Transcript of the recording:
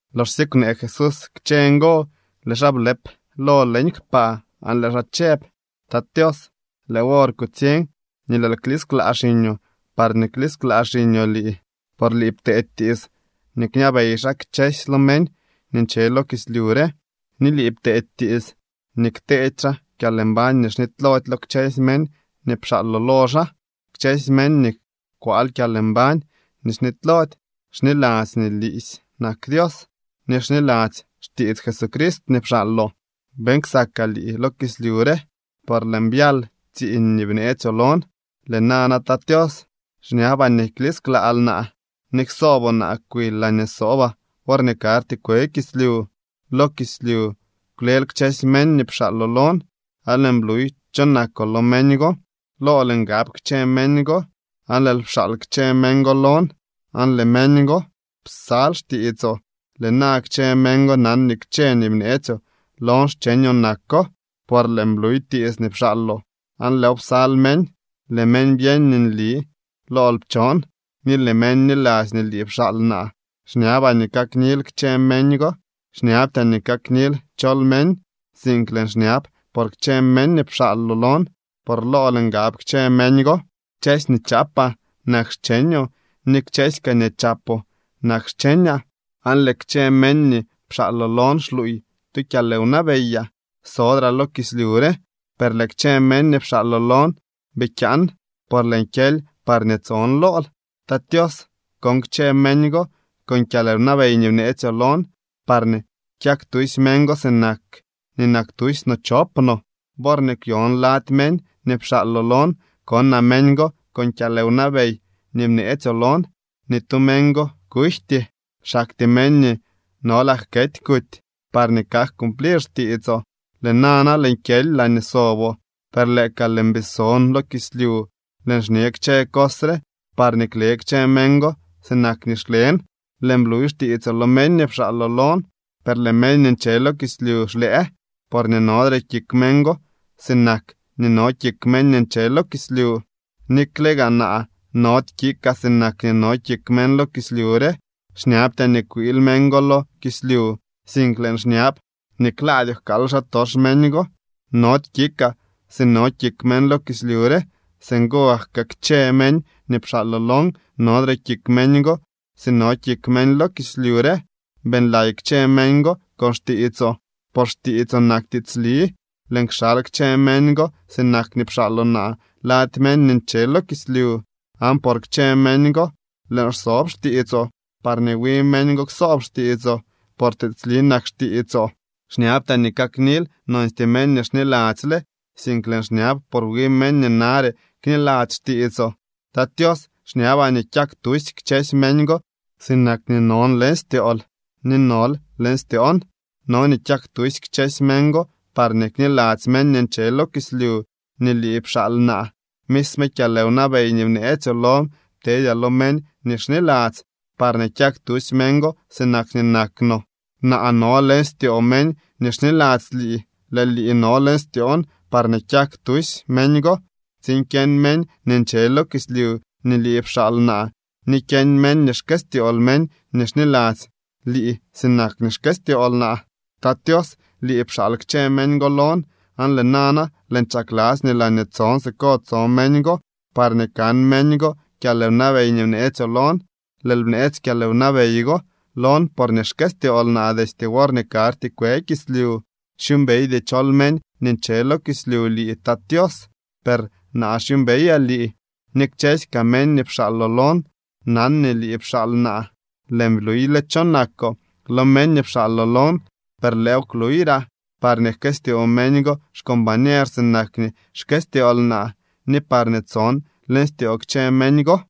Loxsye kwnee Jesús kchë ngo, lëë xaa blëp lo leñ kpaa aan lëë xaa chëb: —Tat Tios, lëë wor kutsiñ nii lëël klisklaa xiñoo parñee klisklaa xiñoo lii. Por lii pteedy tiits nii kñabey xaa kchësy lo meñ nii nche lo kislyu re, ni lii pteedy tiits nii kteedy xaa kyalmbañ nii xnitylody lo kchësy meñ nii pxaaloo lo xaa. Kchësy meñ nii kwaal kyalmbañ nii xnitylody xniladzy nii liisy nak Dios ni xniladzy xtiits Jesucrist nii pxaaloo. ’Beeñ ksakaa lii lo kislyu re, por lëën byal tsiiñ nii bneetsyoo lon. Lëë nana, Tat Tios, xñabaa nii klisklaal naa ni ksooboo naa kwil laañee sobaa worñee karty kwe kislyu. ’Lo kislyu kwlel kchësy meñ nii pxaaloo lon, aan lëën bluy cho nakoo lo meñ go. Lool ngab kchë meñ go, aan lëël pxaal kchë meñ go lon, aan lëë meñ go psal xtiitsoo. Lëë na kchë meñ go nan nii kchë nii bneetsyoo lon xcheñoo nako. Por lëën bluy tiits nii pxaaloo, aan lëëw psal meñ. Lëë meñ byeñ nii nli lool pchon, ni lëë meñ bniladzy nii lii pxaal naa. ’Xñabaa nii kaknil kchë meñ go. Xñabtyaa nii kaknil chol meñ, sink lëën xñab por kchë meñ nii pxaaloo lon, por lool ngab kchë meñ go. Kchësy nii chaapaa nak xcheñoo, ni kchësy kaa nii chapoo nak xcheñaa, aan lëë kchë meñ nii pxaaloo lon xluuy tu kyalwnabeyaa. ’Sodraa lo kislyu re, per lëë kchë meñ nii pxaaloo lon bii kyaan, por lëën kyely parñee tson lool. Tat Tios, kon kchë meñ go con kyalwnabey nii bneetsyoo lon, parñee kyak tusy meñ go sinak nii nak tusy no chop no. Worñee kwyon lady meñ nii pxaaloo lon, konaa meñ go con kyalwnabey nii bneetsyoo lon. Ni tu meñ go kujty. Xaktyee meñ nii nolak kety kuty, parñee kak cumplir xtiitsoo. ’Lëë nana lëën kyely laañee soboo. Per lëë ka lëën bii so lo kislyu lëën xñe kchë cos re, parñee kle kchë meñ go sinak nii xlen. Lëën bluy xtiitsoo lo meñ nii pxaaloo lon, per lëë meñ nii nche lo kislyu xlëë porñee nodre kik meñ go sinak nii no kik meñ nii nche lo kislyu, nikle gaa naa nody kikaa sinak nii no kik meñ lo kislyu re. Xñabtyaa nii kwiil meñ go lo kislyu, sink lëën xñab nii klaadyoo jkaal xaatox meñ go. Nody kikaa si no kik meñ lo kislyu re. Singo gak kaa kchë meñ nii pxaaloo lon, nodre kik meñ go si no kik meñ lo kislyu re. Beeñlay kchë meñ go con xtiitsoo, por xtiitsoo nak tiitsli. Lëën kxal kchë meñ go sinak nii pxaaloo naa lady meñ nii nche lo kislyu. Aan por kchë meñ go lëën xsob xtiitsoo, parñee wi meñ go ksoob xtiitsoo. Por tiitsli nak xtiitsoo. ’Xñabtyaa nii kaknil nonstyee meñ nii xniladzyle, sink lëën xñab por wi meñ nii nare kniladzy xtiitsoo. Tat Tios, xñabaa nii kyak tusy kchësy meñ go sinak nii non leñ styool ni nol leñ styoon. No nii kyak tusy kchësy meñ go parñee kniladzy meñ nii nche lo kislyu nii lii pxaal naa. Misme kyalwnabey nii bneetsyoo lon ptedyaa lo meñ nii xniladzy parñee kyak tusy meñ go sinak nii nak no. Naa no leñ styoo meñ nii xniladzy lii, lëë lii no leñ styoon parñee kyak tusy meñ go, tsiin kyeñ meñ nii nche lo kislyu nii lii pxaal naa ni kyeñ meñ nii xkëstyool meñ nii xniladzy lii sinak nii xkëstyool naa. ’Tat Tios, lii pxaal kchë meñ go lon, aan lëë nana lëën chakladzy nii laañee tson siko tso meñ go, parñee kan meñ go kyalwnabey nii bneetsyoo lon. Lëël bneetsy kyalwnabey go lon porñee xkëstyool naa destye worñee karty kwe kislyu. Xyuumbeydy chol meñ nii nche lo kislyu lii, Tat Tios, per naa xyuumbeyaa lii, ni kchësy kaa meñ nii pxaaloo lon nan nii lii pxaal naa. Lëën bluyle cho nakoo lo meñ nii pxaaloo lon, per lëëw kluyraa, parñee jkëstyoo meñ go xcombañer sinak nii xkëstyool naa, ni parñee tson leñ styoo kchë meñ go.